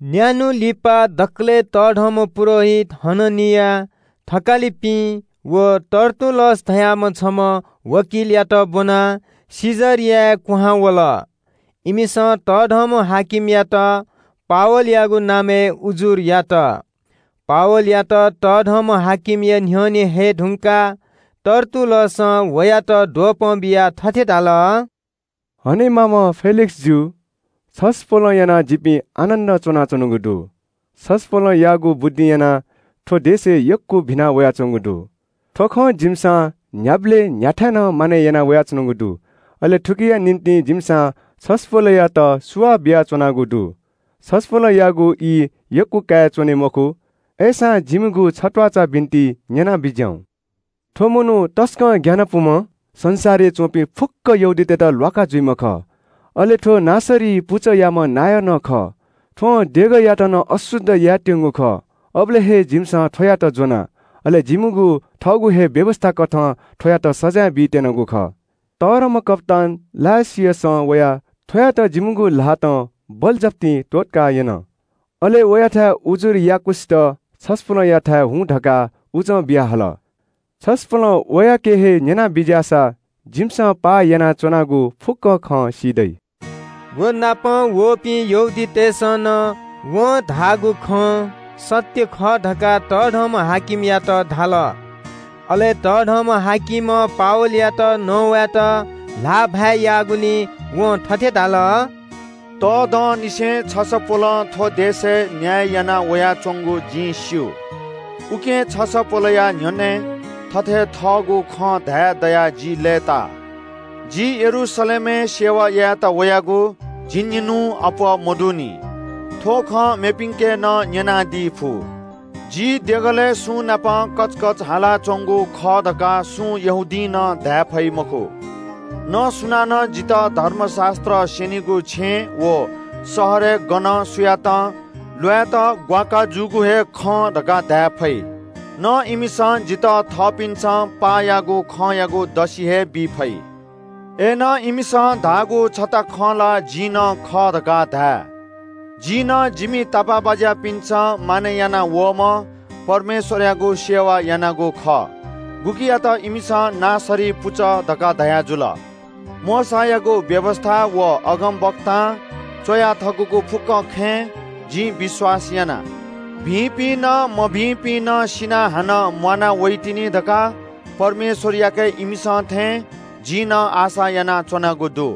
न्‍यान्‍हु लिपा दकलय् तःधंम्‍ह पुजाहारी हननिया, थकालिपिं व तर्तुल्‍लस धाःम्‍ह छम्‍ह वकिलयात ब्‍वनाः कैसरियाय् क्‍वहां वल। इमिसं बडा-हाकिमयात पावलयागु नामय् उजुर यात। पावलयात बडा-हाकिमया न्‍ह्यःने हये धुंकाः तर्तुल्‍लसं वयात द्वपं बियाः थथे धाल – “हनेमाःम्‍ह फेलिक्‍सजु, छसपोलं यानाः जिपिं आनन्‍दं च्‍वनाच्‍वनागु दु। छसपोलयागु बुद्धिं यानाः थ्‍व देशय् यक्‍व भिना वयाच्‍वंगु दु। थ्‍व खँ जिमिसं न्‍ह्याबलें न्‍ह्याथाय् नं मानय् याना वयाच्‍वनागु दु। अले थुकिया निंतिं जिमिसं छसपोलयात सुभाय् बियाच्‍वनागु दु। छसपोलयागु ई यक्‍व कयाच्‍वने मखु, अय्‌सां दया यानाः जिमिगु छत्‍वाःचा बिन्‍ति न्‍यना बिज्‍याहुँ। थ्‍व मनू तसकं ग्‍यानापुम्‍ह, संसारय् च्‍वंपिं फुक्‍क यहूदीतय्‌त ल्‍वाका जूम्‍ह खः। अले थ्‍व नासरी पुचःयाम्‍ह नायः नं खः। थ्‍वं देगःयात नं अशुद्ध यायेत्‍यंगु खः, अबलय् हे जिमिसं थ्‍वयात ज्‍वना। अले जिमिगु थःगु हे व्‍यवस्‍थाकथं थ्‍वयात सजाँय बीत्‍यनागु खः। तःधंम्‍ह कप्‍तान लुसियसं वयाः थ्‍वयात जिमिगु ल्‍हातं बलजफ्ती त्‍वःतका यन। अले वयाथाय् उजुर याःवंक्‍वसित छसपोलयाथाय् हुँ धकाः उजं बियाहल। छसपोलं वयाके हे न्‍यनाबिज्‍याःसा जिमिसं पाः यानाच्‍वनागु फुक्‍क खँ सी दइ।” व नाप वःपिं यहूदीतय् नायःतय्‌सं नं वं धाःगु खँ सत्‍य खः धकाः बडा-हाकिमयात धाल। अले बडा-हाकिमं पावलयात नवायेत ल्‍हाःभाय् याःगुलिं वं थथे धाल – “यक्‍व दंनिसें छसपोलं थ्‍व देशय् न्‍याय याना वयाच्‍वंगु जिं स्‍यू। उकिं छसपोलया न्‍ह्यःने थथे थःगु खँ धाये दयाः जि लय्‌ता। जि यरूशलेमय् परमेश्‍वरया आराधना यायेत वयागु झिंनिन्‍हुं अप्‍वः मदुनि। थ्‍व खँ मेपिन्‍के नं न्‍यनादी फु। जि देगलय् सुंनाप कचकच हालाच्‍वंगु खः धकाः सुं यहूदीं नं धाये फइ मखु। न सुनानं जितः धर्मशास्‍त्र स्‍यनिगु छेँय् व शहरय् गनं सुयातं ल्‍वायेत ग्‍वाकाः जूगु हे खं धकाः धाये फइ। न इमिसं जितः थःपिन्‍सं पाः याःगु खँयागु दसि हे बी फइ। “अय्‌नं इमिसं धाःगु छता खँ ला जिं नं खः धकाः धाये। जिं नं जिमि तापाःबाज्‍यापिन्‍सं मानय् याना वःम्‍ह परमेश्‍वरयागु आराधना यानागु खः, गुकियात इमिसं ‘नासरी पुचः’ धकाः धयाजुल। मोशायागु व्‍यवस्‍था व अगमवक्तां च्‍वया थकूगु फुक्‍क खँय् जिं विश्‍वास याना। भिंपिं नं मभिंपिं नं सिनाः हानं म्‍वाना वइतिनि धकाः परमेश्‍वरयाके इमिसं थें जिं नं आशा यानाच्‍वनागु दु।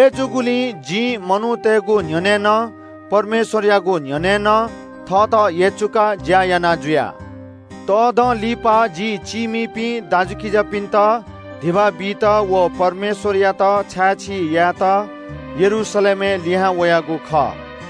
अय्‌जूगुलिं जिं मनूतय्‌गु न्‍ह्यःने नं परमेश्‍वरयागु न्‍ह्यःने नं थःत यचुकाः ज्‍या याना जुया।” “यक्‍व दँ लिपा जि चीमिपिं दाजुकिजापिन्‍त धिबा बीत व परमेश्‍वरयात छाय्‌छी यायेत यरूशलेमय् लिहां वयागु खः।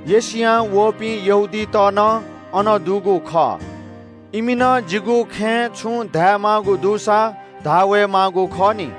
एशियां वःपिं यहूदीत नं अन दुगु खः, इमि नं जिगु खँय् छुं धायेमाःगु दुसा धाः वये माःगु खः नि।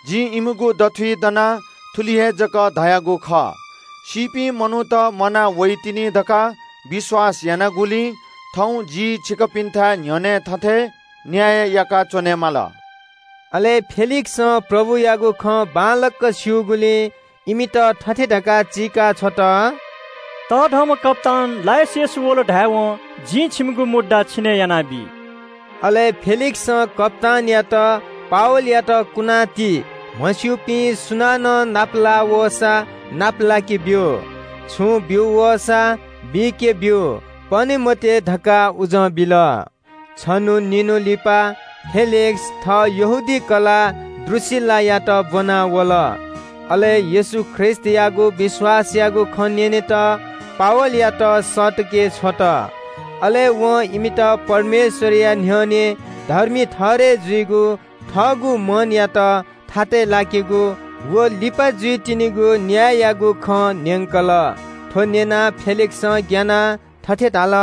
जिं इमिगु दथुइ दनाः थुलि हे जक धयागु खः – ‘सीपिं मनूत म्‍वाना वइतिनि धकाः विश्‍वास यानागुलिं थौं जि छिकपिन्‍थाय् न्‍ह्यःने थथे न्‍याय याका च्‍वनेमाल।’” फेलिक्‍सं प्रभुयागु खँ बांलाक स्‍यूगुलिं इमित थथे धकाः चीकाछ्वल – “तःधंम्‍ह कप्‍तान लुसियस वल धायेवं जिं छिमिगु मुद्दा छिने यानाबी।” अले फेलिक्‍सं कप्‍तानयात “पावलयात कुना ति, म्‍हस्‍यूपिं सुनानं नापलाः वःसा नापलाके ब्‍यु। छुं ब्‍यू वःसा बीके ब्‍यु, पने मते” धकाः उजं बिल। छन्‍हु निन्‍हु लिपा फेलिक्‍स थः यहूदी कलाः द्रूसिल्‍लायात ब्‍वनाः वल। अले येशू ख्रीष्‍टयागु विश्‍वासयागु खँ न्‍यनेत पावलयात सःतके छ्वल। अले वं इमित परमेश्‍वरया न्‍ह्यःने धर्मी ठहरय् जुइगु, थःगु मनयात थातय् लाकेगु व लिपा जुइतिनिगु न्‍याययागु खँ न्‍यंकल। थ्‍व न्‍यनाः फेलिक्‍सं ग्‍यानाः थथे धाल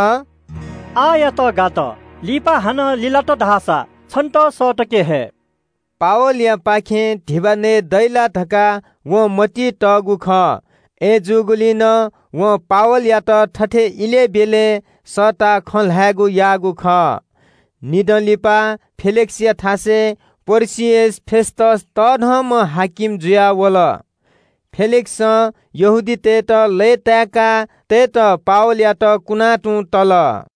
– “आःयात गात, लिपा हानं लिलात धाःसा छन्‍त सःतके हये।” पावलयापाखें धिबा नयेदइ ला धकाः वं मतिइ तःगु खः। अय्‌जूगुलिं नं वं पावलयात थथे इलय् ब्‍यलय् सःताः खँ ल्‍हायेगु याःगु खः। निदँ लिपा फेलिक्‍सया थासय् पर्किअस फेस्‍तस बडा-हाकिम जुयाः वल। फेलिक्‍सं यहूदीतय्‌त लय्‌ताय्‌का तयेत पावलयात कुना तुं तल।